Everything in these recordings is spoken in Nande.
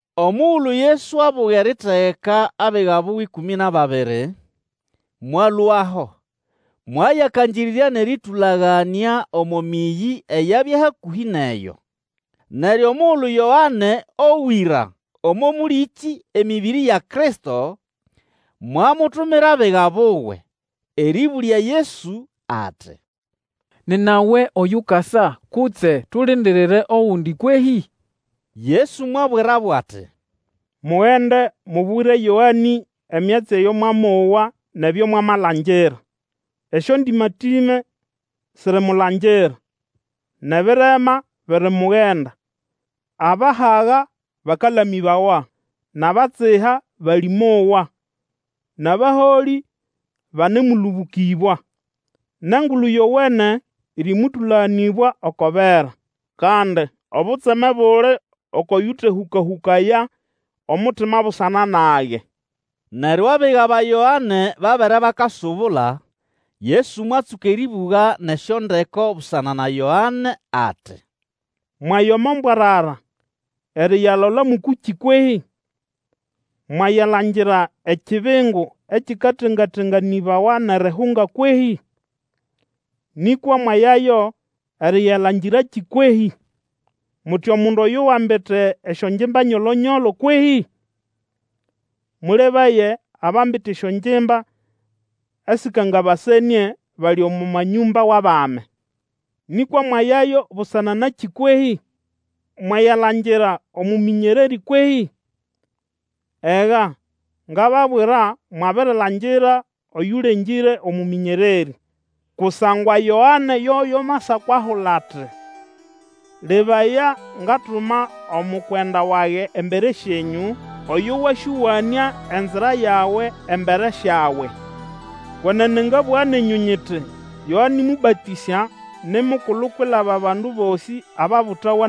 Omugulu Yesu abuga eritegeka abiga buwe ĩkũmĩ nʼababiri, mwalũaho, mwayakangĩrĩrya nʼerĩtũlanganĩa omo mĩyĩ eyabya hakũhĩ nʼeyo. Neryo omugulu Yoane owĩra omo mũlĩkĩ emĩbĩrĩ ya Kristo, mwamutumira abiga buwe, erĩbũlya Yesu, ati, Nina we oyukasa, kutse tulindirire ogundi kwehĩ? Yesu mwasũbĩryabo ati, Mugende, mubwire Yoane emyatsi eyo mwamowa nʼebyo mwamalangira. Esyondĩmatĩme sirimulangira, nʼebirema birimugenda, abahaga bakalamĩbawa nʼabatsiha balĩmowa, nʼabaholĩ banemũlũbũkĩbwa, nʼEngulu Yowene ĩrĩmũtũlaganĩbwa oko bera. Kandi obutseme buli oko yũtehũkahũkaya omutima busana nage! Neryo abiga ba Yoane babere bakasubula, Yesu mwatsũka erĩbũga nʼesyondeko busana na Yoane ati, Mwaya omo mbwarara eriyalola mʼũkũkĩ kwehĩ? Mwayalangira ekibingu ekikatengatenganĩbawa nʼerihunga kwehĩ? Nĩkwa mwayayo eriyalangirakĩ kwehĩ? Muti, omundu oyo wambite esyongimba nyolo-nyolo kwehĩ? Mũlebaye abambite esyongimba esĩkangabasenĩe bali omo manyũmba wʼabami. Nĩkwa mwayayo busana nakĩ kwehĩ? Mwayalangira omũmĩnyererĩ kwehĩ? Ega, ngababwira mwabirilangira oyũlengĩre omũmĩnyererĩ. Kusangwa Yoane yoyo amasako ahula ati, Lebaya, ngatuma omukwenda wage embere syenyũ, Oyo wasyowanĩa enzira yawe embere syawe. Kwenene ngabũga nenyũ nyiti, Yoane Mũbatĩsya ni mukulu kwilaba abandu bosĩ ababutawa.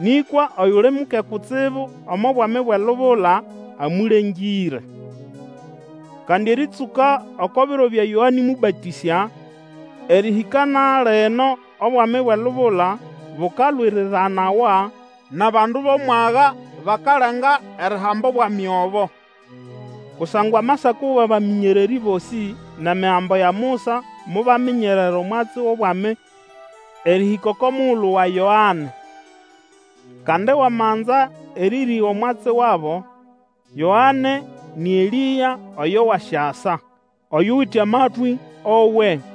Nĩkwa oyuli muke kutsibu omo Bwami bwʼelubula, amũlengĩre. Kandi erĩtsũka oko biro bya Yoane Mũbatĩsya, erĩhĩka na lino Obwami bwʼelubula bukalwiriranawa, nʼabandu bʼomwaga bakalenga erihamba obwami obo. Kusangwa amasako wʼabamĩnyererĩ bosĩ, nʼEmigambo ya Musa mobyaminyerera omwatsi wʼobwami erĩhĩka oko mugulu wa Yoane. Kandi wamanza erĩrĩga omwatsi wabo, Yoane nĩ Elĩa oyo wasyasa. Oyuwite amatwĩ, owe!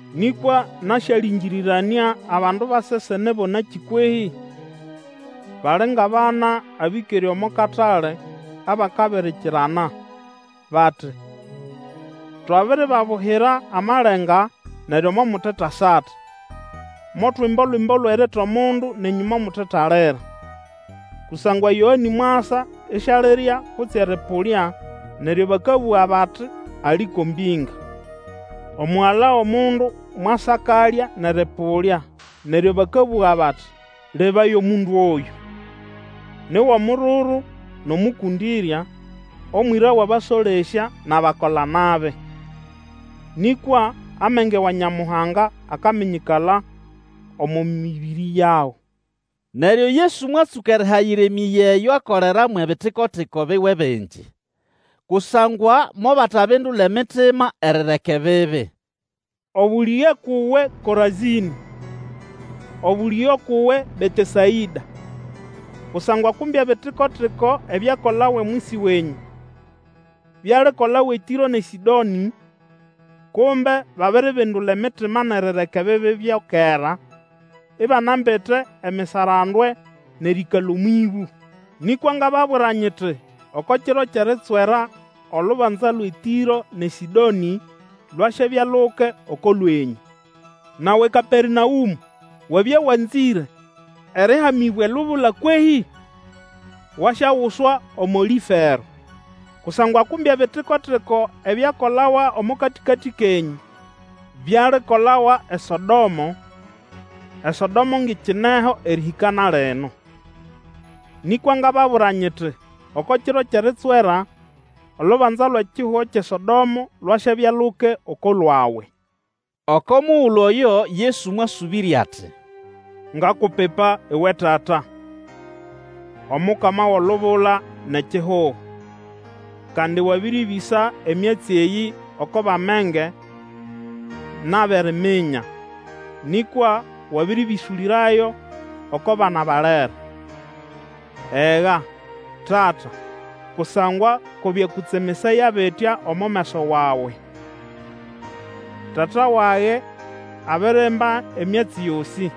Nĩkwa nasyalĩngĩrĩranĩa abandu ba sesene bo nakĩ kwehĩ? Bali ngʼabana abĩkere omo katale abakabirikirana, bati, Twabiribabuhira amalenga, neryo momutetasata; motwimba Olwimbo lwʼerita omundu, nenyũ momutetalira. Kusangwa Yoane mwasa, isialirya kutse erĩpũlya, neryo bakabũga bati, Ali ko mbinga! Omugala wʼomundu mwasa akalya nʼerĩpũlya, neryo bakabũga bati, Lebaya omundu oyũ! Ni wʼomururu nʼomũkũndĩrya, omwĩra wʼabasolesya nʼabakola-nabi. Nĩkwa amenge wa Nyamuhanga akaminyĩkala omo mĩbĩrĩ yago. Neryo Yesu mwatsũka erihayira emĩyĩ eyo akolera mwʼebitiko-tiko biwe bingi, kusangwa mobatabindula emitima erireka ebibi. Obũlĩge ukʼuwe Korazĩnĩ! Obũlĩge ukʼuwe Betesaĩda! Kusangwa kumbe ebitiko-tiko ebyakolawa omwisi wenyũ, bialikolawa eTĩro nʼeSĩdonĩ, kumbe babiribindula emitima nʼerireka ebibi byo kera, ibanambite emisarandwe nʼerĩĩkala omwʼĩbũ. Nĩkwa ngababwira nyiti, Oko kiro kyʼeritswera, olubanza lwʼeTĩro nʼeSĩdonĩ lwasyabya luke oko lwenyũ. Nawe Kapernaũmũ! Wabya wanzĩre erĩhamĩbwa elubula kwehĩ? Wasyaguswa omo Lĩfero. Kusangwa kumbe ebitiko-tiko ebyakolawa omo katĩkatĩ kenyũ, byalikolawa eSodomo, eSodomo ngʼikineho erĩhĩka na lino. Nĩkwa ngababwira nyiti, Oko kiro kyʼeritswera, olubanza lwʼekihugo kyʼeSodomo lwasyabya luke oko lwawe. Oko mugulu oyo Yesu mwasũbĩrya ati, Ngakupipa uwe Tata, Omukama wʼolubula nʼekihugo! Kandi wabĩrĩbĩsa emyatsi eyĩ oko bʼamenge nʼabʼeriminya, nĩkwa wabĩrĩbĩsũlĩrayo oko bana balere. Ega, Tata, kusangwa ko byakũtsemesaya bitya omo meso wawe. Tata wage abirimba emyatsi yosĩ.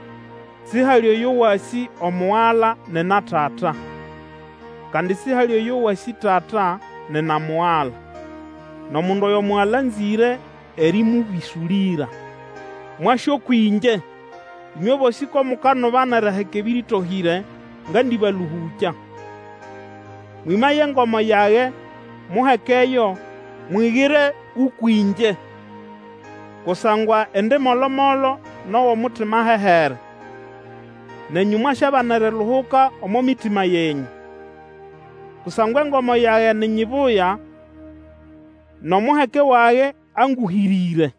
Sihali oyo wasĩ Omugala nina Tata, kandi sihali oyo wasĩ Tata nina Mugala, nʼomundu oyo Mugala anzĩre erĩmũbĩsũlĩra. Mwase ũkwʼĩngye, ĩnywe bosĩ ko mukanuba nʼeriheka ebĩrĩtohĩre, ngandibalũhũkya. Mwĩmaye engomo yage, muhekeyo, mwigire ũkwʼĩngye, kusangwa indi molo-molo nʼowʼomutima ahehere; nenyũ mwasyabana eriluhuka omo mitima yenyũ. Kusangwa engomo yage ni nyibuya, nʼomuheke wage angũhĩre.